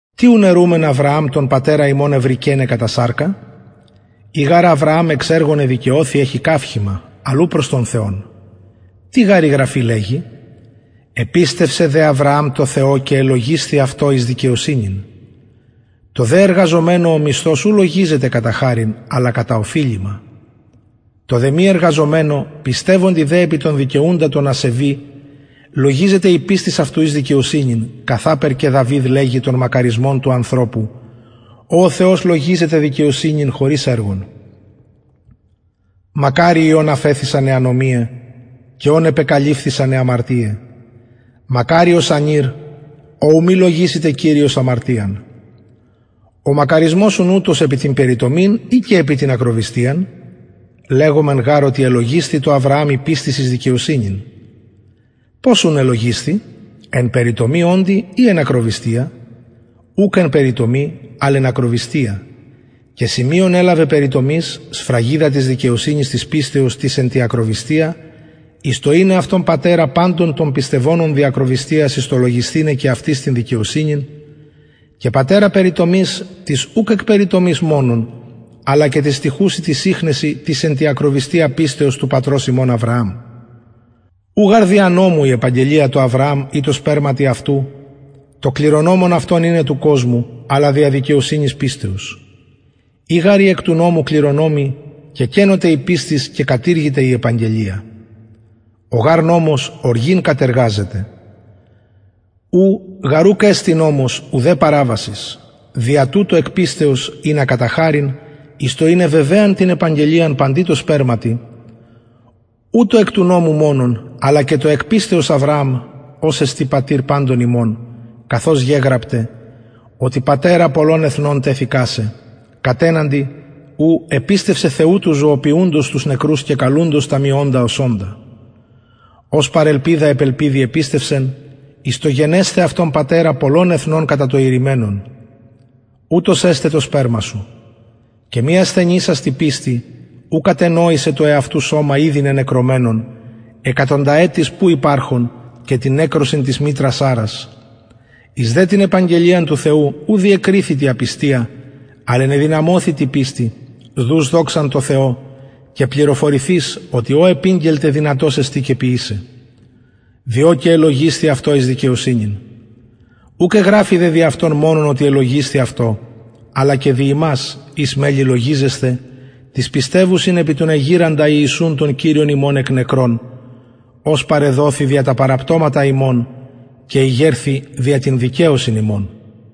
τι ουν ερουμεν αβρααμ τον πατερα ημων ευρηκεναι κατα σαρκα ει γαρ αβρααμ εξ εργων εδικαιωθη εχει καυχημα αλλ ου προς τον θεον τι γαρ η γραφη λεγει επιστευσεν δε αβρααμ τω θεω και ελογισθη αυτω εις δικαιοσυνην τω δε εργαζομενω ο μισθος ου λογιζεται κατα χαριν αλλα κατα οφειλημα τω δε μη εργαζομενω πιστευοντι δε επι τον δικαιουντα τον ασεβη λογιζεται η πιστις αυτου εις δικαιοσυνην καθαπερ και δαυιδ λεγει τον μακαρισμον του ανθρωπου ω ο θεος λογιζεται δικαιοσυνην χωρις εργων μακαριοι ων αφεθησαν αι ανομιαι και ων επεκαλυφθησαν αι αμαρτιαι μακαριος ανηρ ω ου μη λογισηται κυριος αμαρτιαν ο μακαρισμος ουν ουτος επι την περιτομην η και επι την ακροβυστιαν λεγομεν γαρ οτι ελογισθη τω αβρααμ η πιστις εις δικαιοσυνην πως ουν ελογισθη εν περιτομη οντι η εν ακροβυστια ουκ εν περιτομη αλλ εν ακροβυστια και σημειον ελαβεν περιτομης σφραγιδα της δικαιοσυνης της πιστεως της εν τη ακροβυστια εις το ειναι αυτον πατερα παντων των πιστευοντων δι ακροβυστιας εις το λογισθηναι και αυτοις την δικαιοσυνην και πατερα περιτομης τοις ουκ εκ περιτομης μονον αλλα και τοις στοιχουσιν τοις ιχνεσιν της πιστεως της εν τη ακροβυστια του πατρος ημων αβρααμ ου γαρ δια νομου η επαγγελια τω αβρααμ η τω σπερματι αυτου το κληρονομον αυτον ειναι του κοσμου αλλα δια δικαιοσυνης πιστεως ει γαρ οι εκ νομου κληρονομοι κεκενωται η πιστις και κατηργηται η επαγγελια ο γαρ νομος οργην κατεργαζεται ου γαρ ουκ εστιν νομος ουδε παραβασις δια τουτο εκ πιστεως ινα κατα χαριν εις το ειναι βεβαιαν την επαγγελιαν παντι τω σπερματι ου τω εκ του νομου μονον αλλα και τω εκ πιστεως αβρααμ ος εστιν πατηρ παντων ημων καθως γεγραπται οτι πατερα πολλων εθνων τεθεικα σε κατεναντι ου επιστευσεν θεου του ζωοποιουντος τους νεκρους και καλουντος τα μη οντα ως οντα ος παρ ελπιδα επ ελπιδι επιστευσεν εις το γενεσθαι αυτον πατερα πολλων εθνων κατα το ειρημενον ουτως εσται το σπερμα σου και μη ασθενησας τη πιστει ου κατενοησεν το εαυτου σωμα ηδη νενεκρωμενον εκατονταετης που υπαρχων και την νεκρωσιν της μητρας σαρρας εις δε την επαγγελιαν του θεου ου διεκριθη τη απιστια αλλ ενεδυναμωθη τη πιστει δους δοξαν τω θεω και πληροφορηθεις οτι ο επηγγελται δυνατος εστιν και ποιησαι διο και ελογισθη αυτω εις δικαιοσυνην ουκ εγραφη δε δι αυτον μονον οτι ελογισθη αυτω αλλα και δι ημας οις μελλει λογιζεσθαι τοις πιστευουσιν επι τον εγειραντα ιησουν τον κυριον ημων εκ νεκρων ος παρεδοθη δια τα παραπτωματα ημων και ηγερθη δια την δικαιωσιν ημων